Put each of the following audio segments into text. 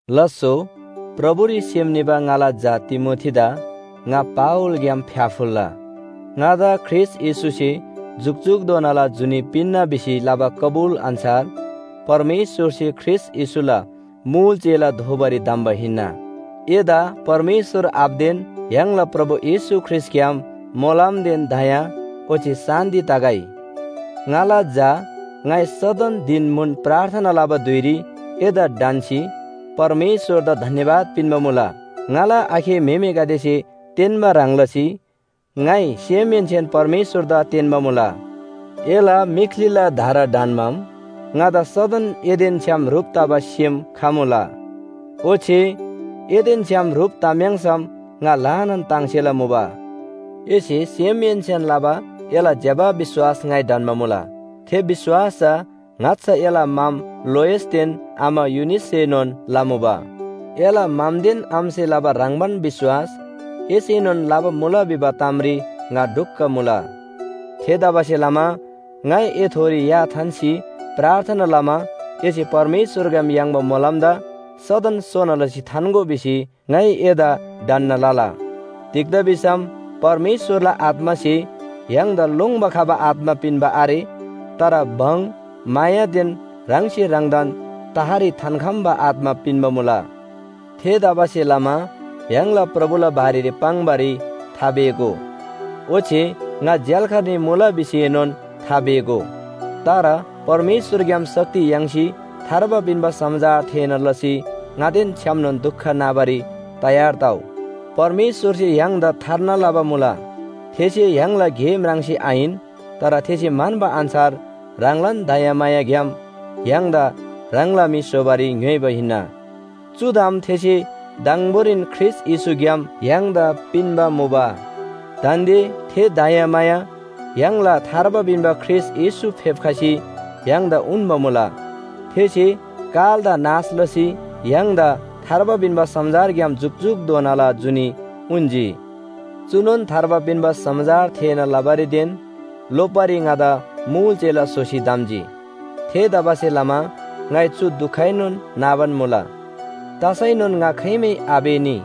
लास्‍सो, प्रभुरी सेम निबा ङाला झा तिमोथीदा ङा पावलग्‍याम फ्‍याफुल्‍ला। ङादा ख्रीष्‍ट येशूसे जुकजुकधोनाला जुनी पिन्‍ना भिसी लबा कबुल अन्‍छार परमेश्‍वरसे ख्रीष्‍ट येशूला मुल चेला दोबारी धम्‍बा हिन्‍ना। एदा परमेश्‍वर आबादेन य्‍हाङला प्रभु येशू ख्रीष्‍टग्‍याम मोलमदेन दया ओच्‍छे शान्‍ति तगै। ङाला झा, ङाइ सदन धिन म्‍हुन प्रार्थना लबा धुइरी एदा ढन्‍सी परमेश्‍वरदा धन्‍यवाद पिन्‍बा मुला। ङाला आखे म्‍हेमेगदेसे तेन्‍बा ह्रङ् लसी ङाइ सेमहेन्‍सेन परमेश्‍वरदा तेन्‍बा मुला। एला मीख्‍लीला धारा ढन्‍माम, ङादा सदन एदेन छ्‌याम ह्रुप तबा सेम खमुला, ओच्‍छे एदेन छ्‌याम ह्रुप तम्‍याङ्‌सम ङा ल्‍हानान ताङ्सेला मुबा। एसे सेमहेन्‍सेन लबा एला ज्‍यबा विश्‍वास ङाइ ढन्‍बा मुला। थे विश्‍वास चा ङाच्‍छा एला मम लोइसदेन आमा युनिससेनोन लमुबा। एला ममदेन आमासे लबा ह्रङ्‌बान विश्‍वास एसेनोन लबा मुला भिबा तामरी ङा ढुक्‍क मुला। थेतबासेलमा ङाइ एथोरी या थान्‍सी प्रार्थना लमा एसे परमेश्‍वरग्‍याम याङ्बा मोलमदा सदन सोना लसी थान्‍गो भिसी ङाइ एदा ढन्‍ना लला। तिग्‍दा भिसम परमेश्‍वरला आत्‍मासे य्‍हाङदा लोङ्‌बा खबा आत्‍मा पिन्‍बा आरे, तर भङ, मायादेन ह्राङसे ह्राङदान तहरी थान्‍खम्‍बा आत्‍मा पिन्‍बा मुला। थेतबासेलमा य्‍हाङला प्रभुला बारेरी पाङ्‌बारी थापेःगो, ओच्‍छे ङा झ्‍याल्‍खानरी मुला भिसीएनोन थापेःगो। तर परमेश्‍वरग्‍याम शक्ति याङ्सी थार्बा पिन्‍बा समाचार थेःना लसी ङादेन छ्‌यामनोन दुख नाबारी तयार तउ। परमेश्‍वरसे य्‍हाङदा थार्ना लबा मुला। थेसे य्‍हाङला गे म्राङ्सी आहिन, तर थेसे म्‍हन्‍बा अन्‍छार ह्राङलान दयामायाग्‍याम य्‍हाङदा ह्राङला म्‍हि स्‍होबारी ङ्‌योइबा हिन्‍ना। चु ताम थेसे दङबोरीन ख्रीष्‍ट येशूग्‍याम य्‍हाङदा पिन्‍बा मुबा। दान्‍दे थे दयामाया य्‍हाङला थार्बा पिन्‍बा ख्रीष्‍ट येशू फेप्‍खसी य्‍हाङदा उन्‍बा मुला। थेसे कालदा नाश लसी य्‍हाङदा थार्बा पिन्‍बा समाचारग्‍याम जुकजुकधोनाला जुनी उन्‍जी। चुनोन थार्बा पिन्‍बा समाचार थेःना लबारीदेन लोप्‍बारी ङादा मुल चेला स्‍होसी धम्‍जी। थेतबासेलमा ङाइ चु दुखएनोन नाबान मुला। तसैनोन ङा खाइमै आपेःनी।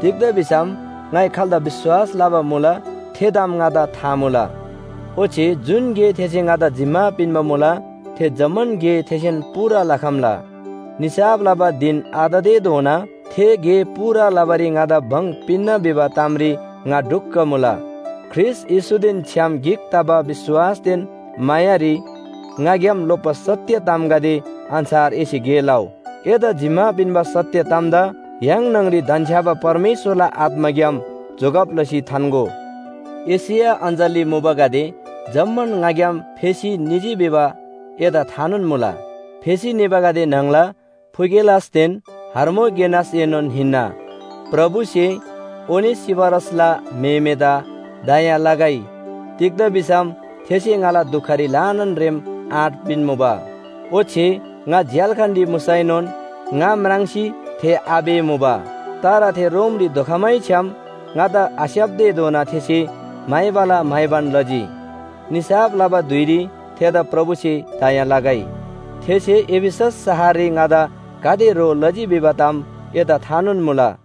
तिग्‍दा भिसम ङाइ खाल्‍दा विश्‍वास लबा मुला थे ताम ङादा था मुला। ओच्‍छे जुन गे थेसे ङादा जिम्‍मा पिन्‍बा मुला थे जम्‍मान गे थेसे पूरा लखम्‍ला। निसाफ लबा धिन आततेधोना थे गे पूरा लबारी ङादा भङ पिन्‍ना भिबा तामरी ङा ढुक्‍क मुला। ख्रीष्‍ट येशूदेन छ्‌याम गिक तबा विश्‍वासदेन मायारी ङाग्‍याम लोप्‍बा सत्‍य तामगदे अन्‍छार एसे गे लउ। एदा जिम्‍मा पिन्‍बा सत्‍य तामदा य्‍हाङ न्‍हङरी धन्‍छ्‌याबा परमेश्‍वरला आत्‍माग्‍याम जोगब लसी थान्‍गो। एशिया अञ्‍चलरी मुबागदे जम्‍मान ङाग्‍याम फेसी निजी भिबा एदा थानोन मुला। फेसी निबागदे न्‍हङला फुगेलसदेन हर्मोगेनसएनोन हिन्‍ना। प्रभुसे ओनेसिफरसला म्‍हेमेदा दया लगै, तिग्‍दा भिसम थेसे ङाला दुखरी ल्‍हानान रेम आँट पिन्‍मुबा, ओच्‍छे ङा झ्‍याल्‍खानरी मुसैनोन ङा म्राङ्सी थे आपेःमुबा। तर थे रोमरी धोखमैछ्‌याम ङादा आस्‍याप्‍तेधोना थेसे म्‍हाइबाला म्‍हाइबान लजी। निसाफ लबा धुइरी थेदा प्रभुसे दया लगै। थेसे एफिसस शहररी ङादा गाते ह्रो लजी भिबा ताम एदा थानोन मुला।